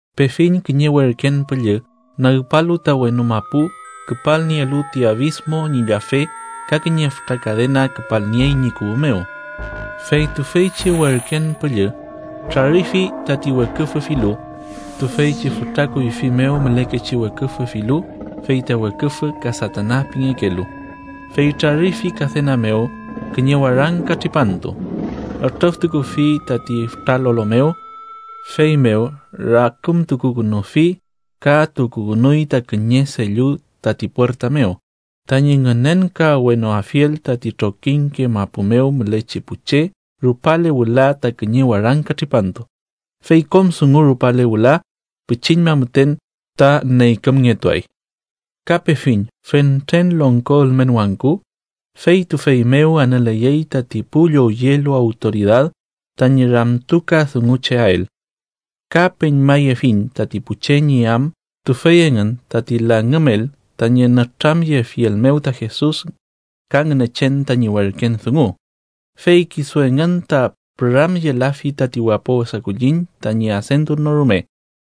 Pefiñ kiñe werken püllü nagpalu ta wenu mapu küpalnielu ti abismo ñi llafe ka kiñe fütra kadena küpalniey ñi kuwü mew. Fey tüfeychi werken püllü trarifi tati weküfü filu, tüfeychi fütra kuyfi mew mülekechi weküfü filu fey ta weküfü ka Satana pingekelu, fey trarifi kadena mew kiñe warangka tripantu. Ütrüftukufi tati fütra lolo mew, feymew rakümtukukünufi, ka tukukünuy ta kiñe sellu tati puerta mew tañi ngünenkawenoafiel tati trokiñke mapu mew mülechi pu che rupale wüla ta kiñe warangka tripantu, fey kom dungu rupale wüla pichiñma müten ta neykümngetuay. Ka pefiñ fentren longko ülmen wangku, fey tüfey mew anüleyey tati pu llowyelu awtoridad tañi ramtukadungucheael. Ka peñmayefiñ tati pu che ñi am tüfey engün tati langümel tañi nütramyefiel mew ta Jesus ka Ngünechen tañi werken dungu. Fey kisu engün ta püramyelafi tati wapo wesa kulliñ tañi adentun no rume,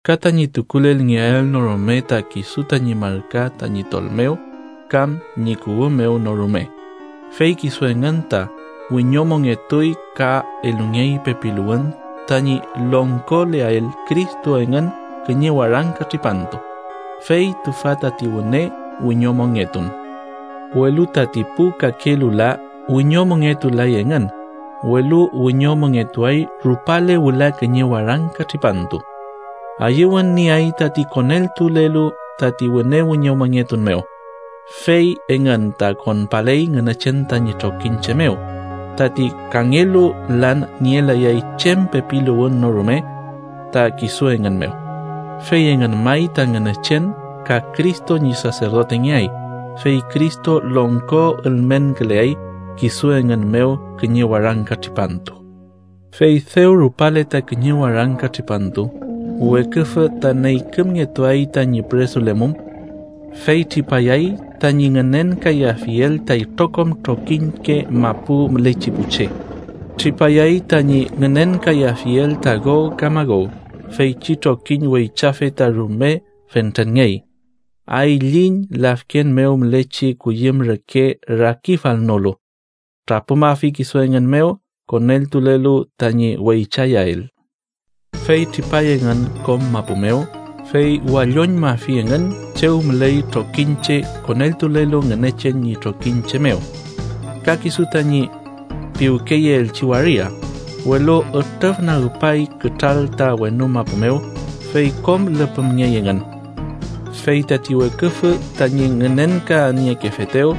ka tañi tukulelngeael no rume ta kisu tañi marka tañi tol mew kam ñi kuwü mew no rume. Fey kisu engün ta wiñomongetuy ka elungey pepiluwün tañi longkoleael Cristo engün kiñe warangka tripantu, fey tüfa tati wüne wiñomongetun. Welu tati pu kakelu la wiñomongetulay engün, welu wiñomongetuay rupale wüla kiñe warangka tripantu. ¡Ayüwün nieay tati koneltulelu tati wüne wiñomongetun mew, fey engün ta konpaley Ngünechen tañi trokiñche mew! Tati kangelu lan nielayay chem pepiluwün no rume ta kisu engün mew, fey engün may ta Ngünechen ka Cristo ñi saserdotengeay, fey Cristo longko ülmenküleay kisu engün mew kiñe warangka tripantu. Fey dew rupale ta kiñe warangka tripantu, Weküfü ta neykümngetuay tañi püresulemum. Fey tripayay tañi ngünenkayafiel ta itrokom trokiñke mapu mülechi pu che, tripayay tañi ngünenkayafiel ta Gog ka Magog, feychi trokiñ weychafe ta rume fentrenngey, ayliñ lafken mew mülechi kuyüm reke rakifalnolu, trapümafi kisu engün mew koneltulelu tañi weychayael. Fey tripay engün kom mapu mew, fey walloñmafi engün chew müley trokiñche koneltulelu Ngünechen ñi trokiñche mew, ka kisu tañi piwkeyeelchi waria. Welu ütrüfnagpay kütral ta wenu mapu mew, fey kom lüpümngey engün. Fey tati weküfü, tañi ngünenkaniekefetew,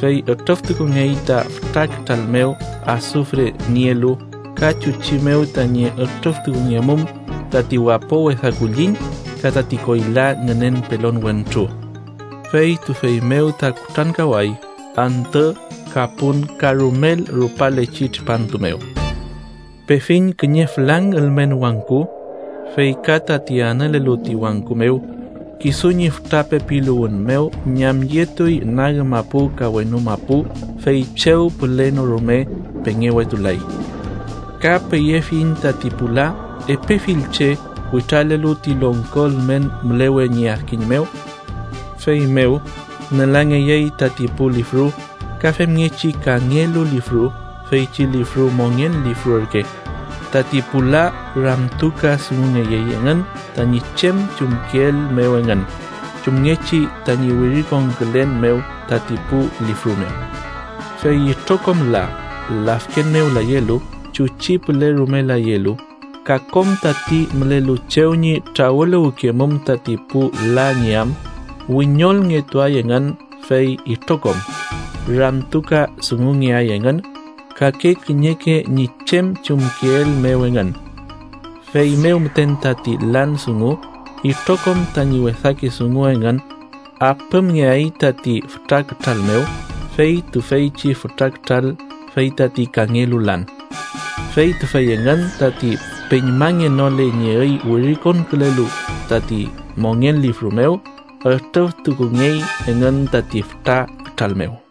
fey ütrüftukungey ta fütra kütral mew asufre nielu, ka chuchi mew tañi ütrüftukungemum tati wapo wesa kulliñ ka tati koyla ngünen pelon wentru. Fey tüfey mew ta kutrankaway antü ka pun ka rumel rupalechi tripantu mew. Pefiñ kiñe fülang ülmen wangku, fey ka tati anülelu ti wangku mew. Kisu ñi fütra pepiluwün mew ñamyetuy nag mapu ka wenu mapu, fey chew püle no rume pengewetulay. Ka peyefiñ tati pu la, epe fill che, witralelu ti longko ülmen mülewe ñi adkiñ mew. Feymew nülangeyey tati pu lifru, ka femngechi kangelu lifru, feychi lifru mongen lifru ürke. Tati pu la ramtukadungungeyey engün tañi chem chumkeel mew engün, chumngechi tañi wirikonkülen mew tati pu lifru mew. Fey itrokom la, lafken mew layelu, chuchi püle rume layelu, ka kom tati mülelu chew ñi trawüluwkemum tati pu la ñi am, wiñolngetuay engün, fey itrokom ramtukadungungeay engün, kake kiñeke ñi chem chumkeel mew engün. Feymew müten tati lan dungu itrokom tañi wesake dungu engün apümngeay tati fütra kütral mew. Fey tüfeychi fütra kütral fey tati kangelu lan. Fey tüfey engün tati peñmangenole ñi üy wirikonkülelu tati mongen lifru mew, ütrüftukungey engün tati fütra kütral mew.